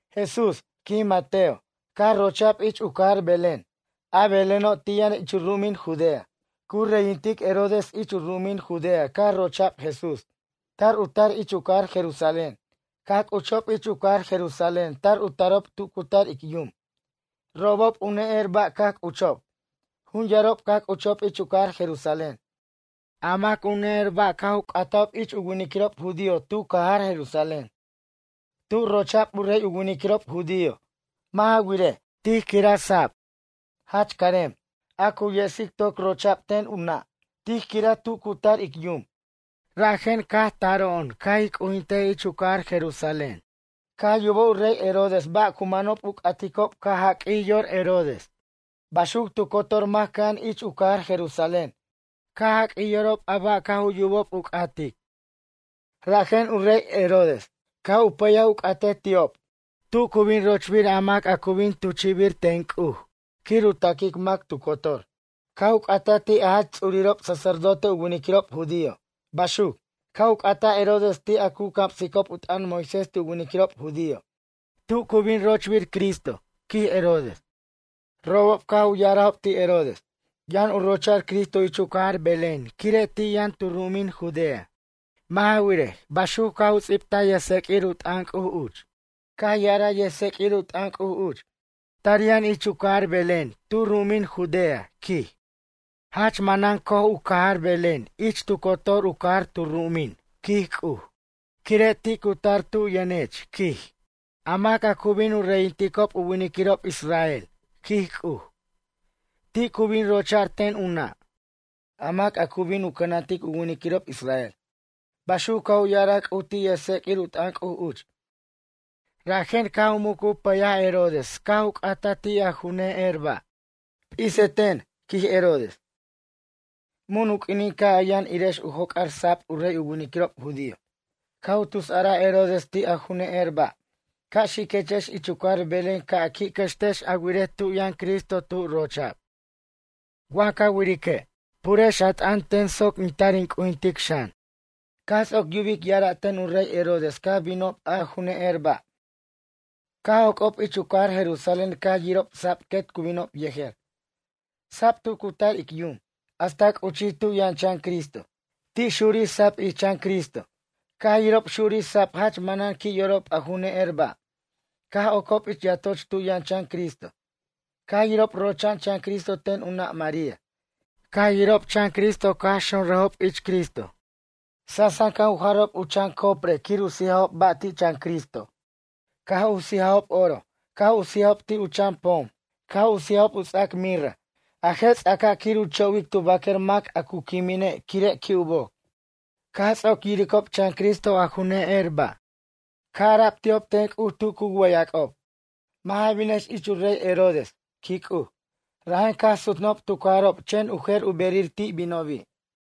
Jesús, quij Mateo, caj rocha'b ich u cajar Belén. A Beléno' ti' yʌn ich u ru'umin Judea. Cu reyintic Herodes ich u ru'umin Judea caj rocha'b Jesús. Tar u tar ich u cajar Jerusalén. Caj c'uchob ich u cajar Jerusalén tar u tarob tu cu tar ic yum. Robob u ne'er ba' caj c'uchob. Jun yarob caj c'uchob ich u cajar Jerusalén. A mac u ne'er ba' caj u c'atajob ich u winiquirob judío tu cajar Jerusalén: ―Tu rocha'b u rey u winiquirob judío? Mʌ' ja wirej, tij quiraj u sab, jach carem, a cu yesic toc rocha'b ten u nʌ'. Tij quiraj tu cu tar ic yum. Rajen caj taro'on ca' ij c'ujintej ich u cajar Jerusalén. Caj yubaj u rey Herodes ba' cu manob u c'aticob caj jaq'uij yor, Herodes. Baxuc tu cotor mac cʌja'an ich u cajar Jerusalén, caj jaq'uij yorob a ba' caj u yubob u c'atobi'. Rajen u rey Herodes, caj u pʌyaj u c'atej ti'ob, tu cu bin rochbir a mac a cu bin tuchi'bir ten C'uj quir u taquic mac tu cotor. Caj u c'ataj ti' u jach ts'urirob sacerdote u winiquirob judío. Baxuc, caj u c'ataj Herodes ti' a cu camsicob u t'ʌn Moisés ti' u winiquirob judío: ―Tu cu bin rochbir Cristo? ―quij Herodes. Robob caj u ya'arajob ti' Herodes: ―Yʌn u rocha'r Cristo ich u cajar Belén quire' ti' yʌn tu ru'umin Judea. Mʌ' ja wirej, baxuc caj u ts'ibtaj yʌjtseq'uir u t'ʌn C'uj uch: Caj ya'araj yʌjtseq'uir u t'ʌn C'uj uch: Tar yʌn ich u cajar Belén tu ru'umin Judea, quij. Jach manan co'oj u cajar Belén ich tu cotor u cajar tu ru'umin, quij C'uj. Quire' ti' cu tar tub yʌnech, quij, a mac cu bin u reyinticob u winiquirob israel, quij C'uj. Ti' cu bin rocha'r ten u nʌ', a mac a cu bin u cʌnantic u winiquirob israel. Baxuc caj u ya'araj C'uj ti' yʌjtseq'uir u t'ʌn C'uj uch. Rajen caj u muc u pʌyaj Herodes caj u c'ataj ti' a u ne'er ba': ―P'iseten ―quij Herodes― mun u q'uinin caj a yʌn irex u joc'ar sab u rey u winiquirob judío? Caj u tus a'araj Herodes ti' a ju ne'er ba': ―Ca' xiquechex ich u cajar Belén ca' a qui' cʌxtex a wirej tu yʌn Cristo tu rocha'b. Wa ca wirique', purex a t'ʌn ten soc in tar in c'ujintic xan. Caj ts'oc yubic ya'ara' ten u rey Herodes caj binob a ju ne'er ba'. Caj joc'ob ich u cajar Jerusalén caj yirob sab quet cu binob yejer, sab tu cu tar ic yum, hasta c'uchij tu yʌn chan Cristo. Ti' xurij sab ich chan Cristo. Caj yirob xurij sab jach manan qui' yorob a ju ne'er ba'. Caj ocob ich yatoch tu yʌn chan Cristo. Caj yirob rocha'an chan Cristo ten u nʌ' María. Caj yirob chan Cristo caj xonrajob ich Cristo quir u c'ujinticob. Sansan caj u jarob u chan coprej quir u sijajob ba' ti' chan Cristo. Caj u sijajob oro. Caj u sijajob ti' u ts'ac pom. Caj u sijajob u ts'ac mirra. A je' ts'aca' quir u cho'wic tu baquer mac a cu quimine' quire' qui' u boc. Caj ts'oc yiricob chan Cristo a ju ne'er ba', caj ara'b ti'ob ten C'uj tu cu wʌyʌc'ob: ―Mʌ' ja binex ich u rey Herodes ―quij C'uj. Rajen caj sutnʌjob tu cajarob chen u jer u berir ti' binobi'.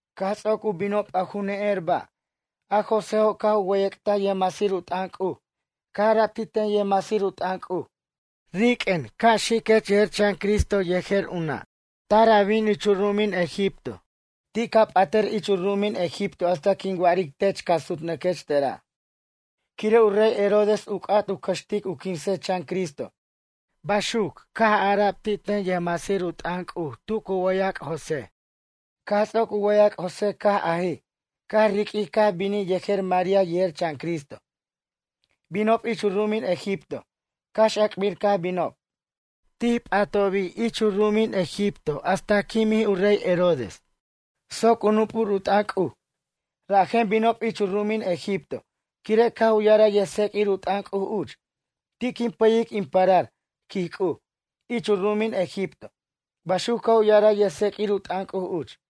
Caj ts'oc u binob a ju ne'er ba'. A Joséjo' caj u wʌyʌc'taj yʌjmasir u t'ʌn C'uj. Caj ara'b ti' ten yʌjmasir u t'ʌn C'uj: ―Riq'uen ca' xiquech yejer chan Cristo yejer u nʌ'. Tar a bin ich u ru'umin Egipto, ti' ca p'atʌr ich u ru'umin Egipto hasta quin wa'aric tech ca' su'nʌquech tera'. Quire' u rey Herodes u c'at u cʌxtic u quinsej chan Cristo ―baxuc caj ara'b ti' ten yʌjmasir u t'ʌn C'uj tu cu wʌyʌc' José. Caj ts'oc u wʌyʌc' José caj ajij, caj riq'uij caj binij yejer María yejer chan Cristo. Binob ich u ru'umin Egipto, cax ac'bir caj binob. Ti' p'atobi' ich u ru'umin Egipto hasta quimij u rey Herodes. Soc u nup'ur u t'ʌn C'uj, rajen binob ich u ru'umin Egipto. Quire' caj u ya'araj yʌjtseq'uir u t'ʌn C'uj uch: “Ti' quin payic in parar, quij C'uj, ich u ru'umin Egipto.” Baxuc caj u ya'araj yʌjtseq'uir u t'ʌn C'uj uch.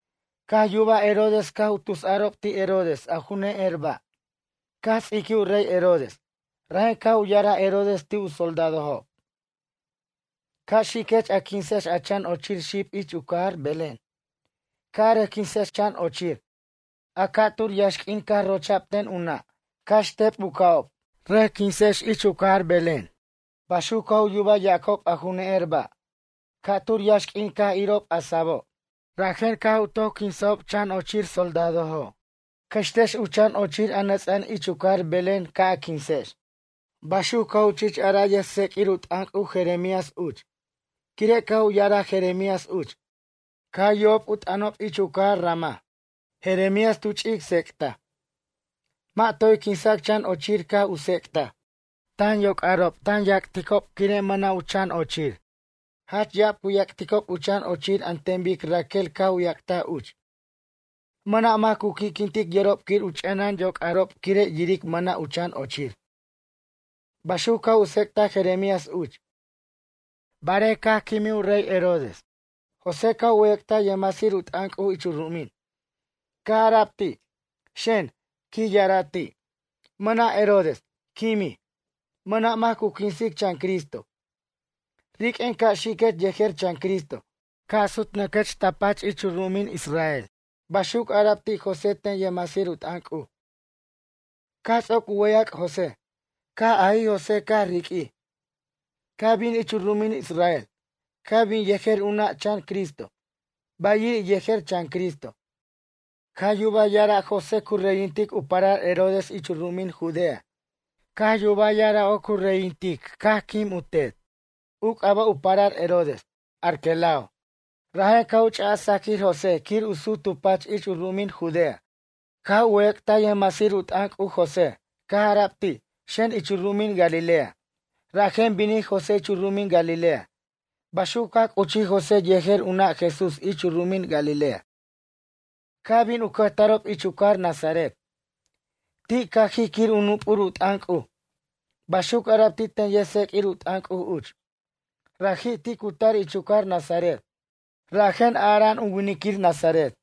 Caj yubaj Herodes caj u tusarob ti' Herodes a ju ne'er ba'. Caj ts'iquij u rey Herodes. Rajen caj u ya'araj Herodes ti' u soldadojob: ―Ca' xiquex a quinsex a chan ochir xib ich u cajar Belén. Ca' a rʌc quinsex chan ochir, a ca'tur yaxq'uin caj rocha'b ten u nʌ'. Cax tep u ca'ob, rʌc quinsex ich u cajar Belén. Baxuc caj u yubaj yacob a ju ne'er ba'. Ca'tur yaxq'uin caj irob a sabo'. Rajen caj u toc quinsajob chan ochir soldadojob: ―Cʌxtex u chan ochir a nʌts'a'an ich u cajar Belén ca' a quinsex. Baxuc caj u ch'ic araj yʌjtseq'uir u t'ʌn C'uj Jeremías uch. Quire' caj u ya'araj Jeremías uch: Caj yubob u t'ʌnob ich u cajar Ramá, Jeremías tu ch'ic tsec'taj. Mʌ' toy quinsac chan ochir caj u tsec'taj: Tan yoc'arob tan yac'ticob quire' mʌna' u chan ochir. Jach ya'ab cu yac'ticob u chan ochir an ten bic Raquel caj u yac'taj uch. Mʌna' mac cu qui'quintic yorob quir u ch'enʌn yoc'arob quire' yiric mʌna' u chan ochir. Baxuc caj u tsec'taj Jeremías uch. Barej caj quimij u rey Herodes. José caj u wʌyʌc'taj yʌjmasir u t'ʌn C'uj ich u ru'umin. Caj ara'b ti': ―Xen ―quij ya'araj ti'―. Mʌna' Herodes, quimij. Mʌna' mac cu quinsic chan Cristo. Riq'uen ca' xiquech yejer chan Cristo. Ca' sutnʌquech ta pach ich u ru'umin Israel ―baxuc ara'b ti' José ten yʌjmasir u t'ʌn C'uj. Caj ts'oc u wʌyʌc' José. Caj ajij José caj riq'uij, caj bin ich u ru'umin Israel. Caj bin yejer u nʌ' chan Cristo, bayiri' yejer chan Cristo. Caj yubaj ya'ara' José cu reyintic u parar Herodes ich u ru'umin Judea. Caj yuba ya'ara' oc u reyintic caj quim u tet. U c'aba' u parar Herodes, Arquelao. Rajen caj u ch'aj sajaquir José quir u sut tu pach ich u ru'umin Judea. Caj u wʌyʌc'taj yʌjmasir u t'ʌn C'uj José. Caj ara'b ti': ―Xen ich u ru'umin Galilea. Rajen binij José ich u ru'umin Galilea. Baxuc caj c'uchij José yejer u nʌ' Jesús ich u ru'umin Galilea. Caj bin u cʌjtarob ich u cajar Nazaret. Ti' cajij quir u nup'ur u t'ʌn C'uj. Baxuc ara'b ti' ten yʌjtseq'uir u t'ʌn C'uj uch: ―Raji' ti' cu tar ich u cajar Nazaret. Rajen ara'an u winiquir nazaret.